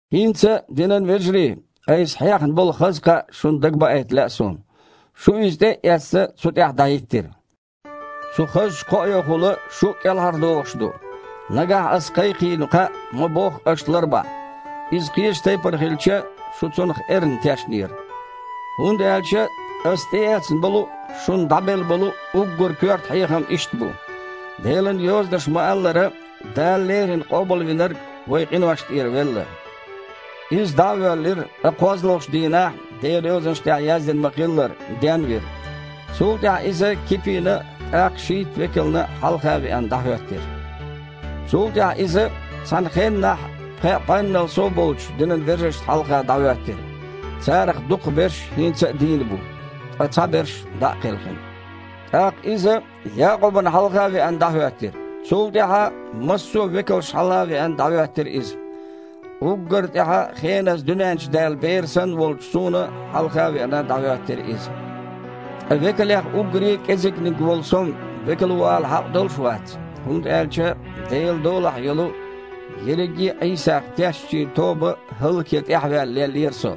ХІинца, динан вежарий, айса хьехна болу хаза кхаъ шуна дагабаийта лаьа суна. Шу, иза тІе а эцна, цу тІехь дІахІиттира. Цу хазачу кхоэхула шу а кІелхьардохуш ду, нагахь аса кхайкхийна кхаъ ма-бохху аша ларбахь. Иза кхечу тайпана хилча, шу цунах эрна тешнера. ХІунда аьлча аса тІеэцна болу а, шуна дІабелла болу а уггар коьрта хьехам иштта бу: Делан Йозанаша ма-аллара, Дала леррина Къобалвинарг вайн къиношна тІера велла. Иза дІа а воьллира, ткъа кхозлагІчу дийнахь, Делан Йозанаш тІехь яздина ма-хиллара, ден а вира. Цул тІаьхьа Иза, Кипина а, тІаккха шийтта векална а хьалха веана, дІахІоьттира. Цул тІаьхьа Иза цхьана хеннахь пхеа бІеннал сов болчу динан вежаршна хьалха дІахІоьттира. Царах дукхахберш хІинца а дийна бу, ткъа цхьаберш дІа а кхелхина. ТІаккха Иза, Якъубана хьалха а веана, дІахІоьттира. Цул тІаьхьа, массо а векалшна хьалха а веана, дІахІоьттира Иза. Уггар а тІаьхьа, хеназа дуьнен чу даьлла бер санна волчу суна хьалха а веана, дІахІоьттира Иза. Ткъа векалех уггаре а кІезигниг волу со-м векал ву ала хьакъ долуш а вац, хІунда аьлча Делан долахь йолу, ерриге а Іийсах тешначийн тоба хІаллакьян тІаьхьаваьлла леллера со.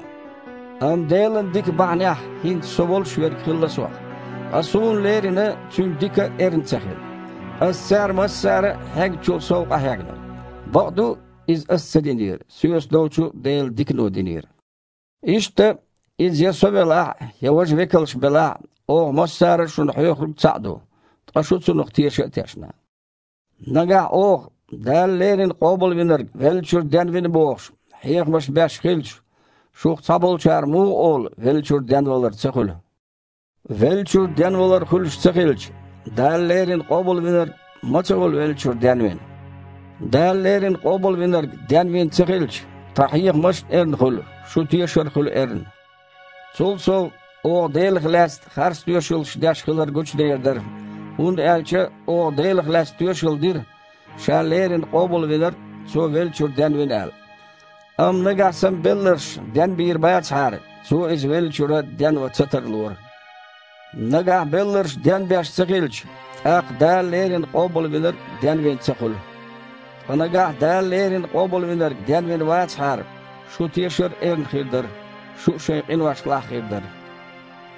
Амма Делан дика бахьанехь хІинца со волуш верг хилла сох. Ткъа суна лерина Цуьнан дика а эрна ца хилла. Аса цара массара а хьегначул сов къахьегна. (Бакъду, иза аса ца динера, соьца долчу Делан дикано динера.) Иштта, иза я со велахь а, я важа векалш белахь а, оха массара а шуна хьоьхург цхьаъ ду, ткъа шу цунах теша а тешна. Нагахь оха, Дала леррина Къобалвинарг веллачуьра денвина бохуш, хьехамаш беш хилча, шух цхьаболчара муха олу веллачуьра денвалар ца хуьлу? Веллачуьра денвалар хуьлуш ца хилча, Дала леррина Къобалвинарг а ма ца хуьлу веллачуьра денвина? Дала леррина Къобалвинарг денвина ца хилча, тхан хьехамаш а эрна хуьлу, шун тешар а хуьлу эрна. Цул сов, оха Делах лаьцна харцтоьшаллаш деш хилар гучудер дара. ХІунда аьлча оха Делах лаьцна тоьшалла дира, Ша леррина Къобалвинарг Цо веллачуьра денвина аьлла. Амма нагахь санна белларш денбийр бацахьара, Цо Иза веллачуьра денван ца тарлора. Нагахь белларш денбеш ца хилча, тІаккха Дала леррина Къобалвинарг а денвина ца хуьлу. Ткъа нагахь Дала леррина Къобалвинарг денвина вацахьара, шун тешар а эрна хир дара, шу а шайн къиношлахь хир дара.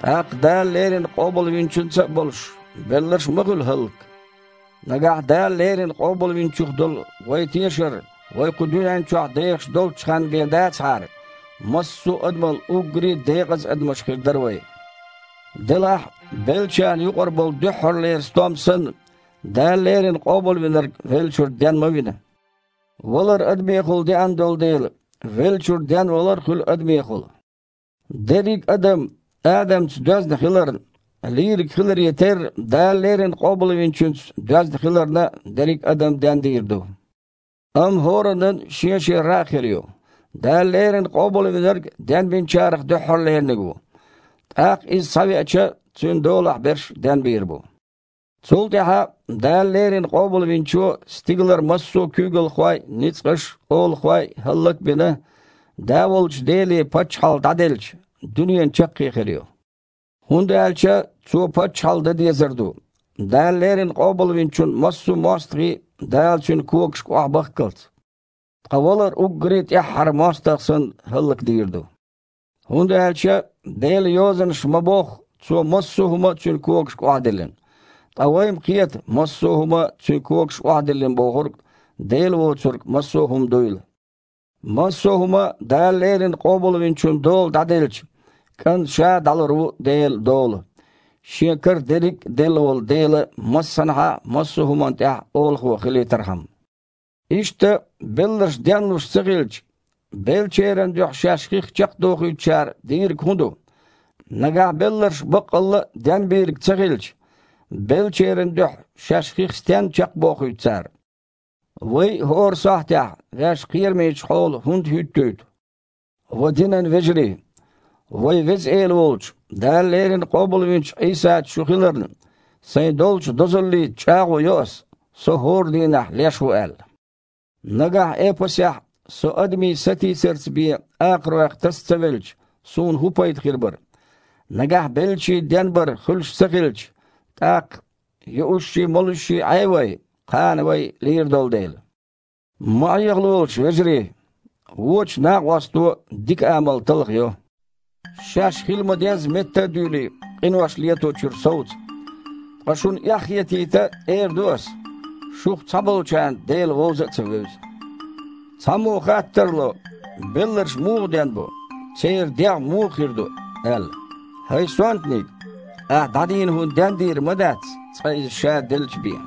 ТІаккха, Дала леррина Къобалвинчуьнца а болуш, белларш а ма хуьлу хІаллак? Нагахь Дала леррина Къобалвинчух долу вайн тешар вай кху дуьнен чохь дехаш долччу ханна бен дацахьара, массо а адамал уггаре а декъаза адамаш хир дара вай. Делахь а, беллачарна юкъара болу дуьххьарлера стом санна, Дала леррина Къобалвинарг веллачуьра ден ма вина. Валар адамехула деана долу дела, веллачуьра денвалар а хуьлу адамехула. Дерриг а адам, Адамца доьзна хиларна, лийриг хиларе терра, Дала леррина Къобалвинчуьнца доьзна хиларна дерриг а адам дендийр ду. Амма хІораннан а шен-шен рагІ хир ю. Дала леррина Къобалвинарг денбинчарах дуьххьарлераниг ву. ТІаккха Иза схьавеача, Цуьнан долахь берш а денбийр бу. Цул тІаьхьа, Дала леррина Къобалвинчо стигалара массо а куьйгалхой а, ницкъаш а, олахой а хІаллак а бина, Да волчу Деле паччахьалла дІаделча, дуьненан чаккхе хир ю. ХІунда аьлча Цо паччахьалла дан дезар ду, Дала леррина Къобалвинчун массо а мостагІий Дала Цуьнан когашка охьабахккалц. Ткъа валар уггаре а тІаьххьара мостагІа санна хІаллакдийр ду. ХІунда аьлча, Делан Йозанаша ма-бохху, «Цо массо а хІума Цуьнан когашка охьадиллина». Ткъа вай-м кхета «массо а хІума» Цуьнан когашка охьадиллина бохург, Дела воцург, массо а хІума дуйла. Массо а хІума Дала леррина Къобалвинчун дола дІаделча, КІанта Ша а дІалур ву Делан дола, Шен кара дерриг а делла волу Дела массанхьа а массо а хІуманна тІехь Олахо хилийтархьама. Иштта, белларш денлуш ца хилча, беллачеран дуьхьа шаьш хих чекхдохуьйтучара дийриг хІун ду? Нагахь белларш баккъалла а денбийрг ца хилча, беллачеран дуьхьа шаьш хих стенна чекхбохуьйту цара? Вай а хІора сахьтехь ваьш кхерамечу хьола хІунда хІуьттуьйту? Ва динан вежарий! Вайн Веза Эла волчу, Дала леррина къобалвинчу Іийсаца шу хиларна, сайн долчу дозаллица чІагІо йо ас, со хІора дийнахь леш ву аьлла. Нагахь Эпасехь со адамийн сатийсарца бен «акхаройх» таса ца велча, суна хІун пайда хир бара? Нагахь беллачийн денбар хуьлуш ца хилча, тІаккха: «Юушший, молушший Іей вай, кхана вай лийр долу дела!» Ма Іехалолаш, вежарий! «Вочу накъосто дика амал талхайо». Шаьш хила ма-дезза метта а дуьйлий, къинош леточуьра совца. Ткъа шуна эхь хетийта эр ду ас: шух цхьаболчарна Дела вовза а ца вевза. Цхьаммо хатта тарло: «Белларш муха денбо? Церан дегІ муха хир ду?» – аьлла. ХІай сонтаниг! Ахьа дІадийна хІу дендийр ма дац, иза цкъа ша делча бен.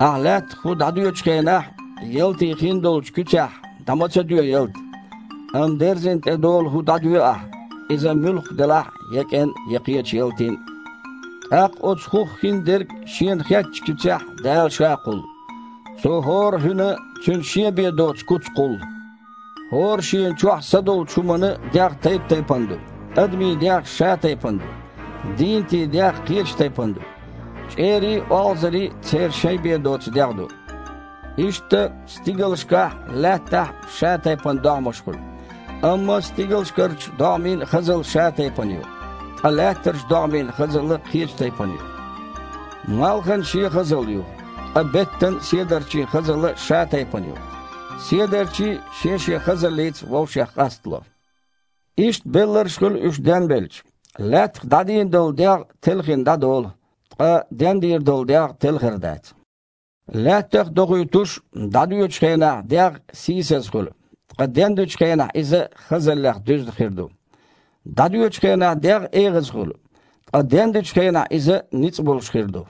Ахьа лаьттах хІу дІадоьчу хенахь, ялтин хиндолчу куьцехь дІа ма ца доь ялта. Амма дерзина тІедолу хІу дІадоь ахьа, иза муьлхха делахь а, я кІен, я кхечу ялтин. ТІаккха оцу хІух хиндерг, Шена хеттачу куьцехь, Дала Ша кхуллу. Цо хІора а хІуьнан цуьнан шен бен доцу куц кхуллу. ХІора шена чохь са долчу хІуманан дегІ тайп-тайпана ду. Адамийн дегІ шатайпана ду. Дийнатийн дегІ кхечу тайпана ду. ЧІерийн а, олхазарийн а церан шайн бен доцу дегІ ду. Иштта стигалшкахь а, лаьттахь а шатайпана догІмаш хуьлу. Амма стигалшкарчу догІмийн хазалла шатайпана ю, ткъа лаьттарчу догІмийн хазалла кхечу тайпана ю. Малхан шен хазалла ю, ткъа беттан, седарчийн хазалла шатайпана ю. Седарчий а шен-шен хазаллица вовшех къастало. Иштта белларш а хуьлу, уьш денбелча. Лаьттах дІадийна долу дегІ телхина дІадолу, ткъа дендийр долу дегІ телхар дац. Лаьттах а дохуьйтуш, дІадоьчу хенахь дегІ сийсаза хуьлу, ткъа дендечу хенахь иза хазаллех дуьзна хир ду. ДІадоьчу хенахь дегІ эгІаза хуьлу, ткъа дендечу хенахь иза ницкъ болуш хир ду.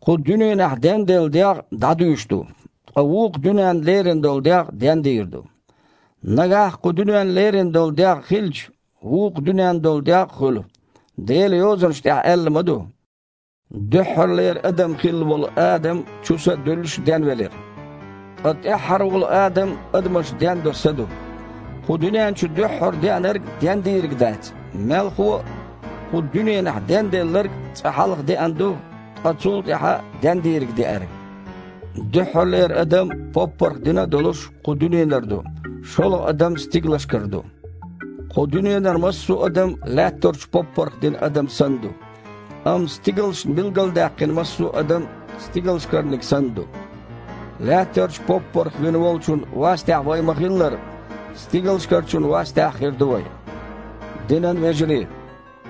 Кху дуьненахь денделла дегІ дІадуьйш ду, ткъа вукху дуьненна лерина долу дегІ дендийр ду. Нагахь кху дуьненна лерина долу дегІ хилча, вукху дуьненна долу дегІ а хуьлу. Делан Йозанаш тІехь аьлла ма ду: «Дуьххьарлера адам хилла волу Адам, чу са а дуьллуш, денвелира». Ткъа тІаьххьара волу Адам адамаш дендо са ду. Кху дуьнен чу дуьххьара деанарг дендийриг дац. Мелхо а, кху дуьненахь денделларг цкъа хьалха деана ду, ткъа цул тІаьхьа дендийриг деара. Дуьххьарлера адам, поппарх дина а долуш, кху дуьненара ду. ШолгІа адам стигалшкара ду. Кху дуьненара массо а адам лаьттарчу поппарх дина адам санна ду. Амма стигалшна билгалдаьккхина массо а адам Стигалшкарниг санна ду. Лаьттарчу поппарх вина волчун вастехь вай ма-хиллара, стигалшкарчун вастехь а хир ду вай. Динан вежарий!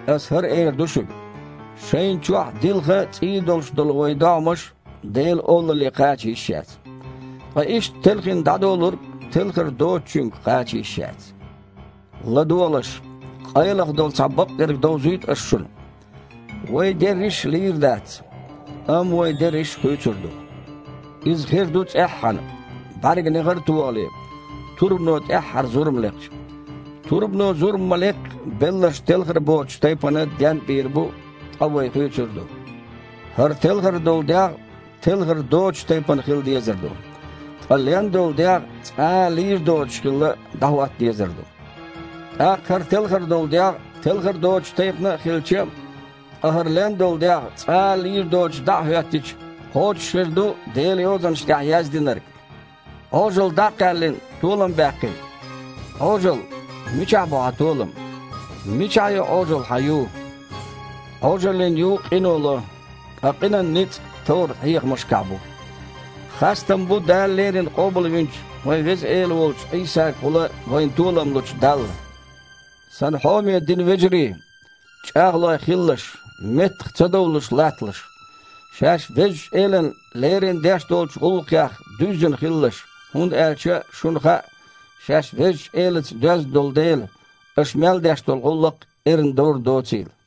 Аса хІара эр ду шуьга: шайна чохь дилха а, цІий а долуш долу вайн догІмаш Делан Олалле кхача йиш яц. Ткъа иштта телхина дІадолург телхар доцучуьнга кхача йиш яц. ЛадогІалаш, къайлаха долу цхьа бакъдерг довзуьйту ас шуна: вай дерриш а лийр дац, амма вай дерриш а хуьйцур ду. Иза хир ду цІеххьана, бІаьрган негІар а тохале, турбано тІаьххьара зурма лекхча. Турбано зурма ма-леккхи, белларш телхар боцучу тайпана ден а бийр бу, ткъа вай хуьйцур а ду. ХІара телхар долу дегІ телхар доцучу тайпана хила дезар ду. Ткъа лен долу дегІ, цкъа а лийр доцуш хилла, дІахІотта дезар ду. ТІаккха хІара телхар долу дегІ телхар доцучу тайпана а хилча, ткъа хІара лен долу дегІ цкъа а лийр доцуш дІа а хІоьттича, кхочушхир ду Делан Йозанаш тІехь яздинарг: «Іожалла дІа а кхаьллина, толам баьккхина». «Іожалла, мичахь бу хьан толам? Мичахь ю, Іожалла, хьан ю?» Іожаллин ю къино ло. Ткъа къинан ницкъ товрат-хьехамашкахь бу. Хастам бу Дала леррина къобалвинчу вайн Веза Эла волчу Іийсагахула вайна толам лучу Далла! Сан хьоме динан вежарий! ЧІагІлой а хилалаш, меттах ца довлуш а латталаш. Шаьш Везачу Элана лерина деш долчу гІуллакхех дуьззина хилалаш, хІунда аьлча шуна хаьа, шаьш Везачу Элаца доьзна долу дела, аша мел деш долу гІуллакх эрна довр доцийла.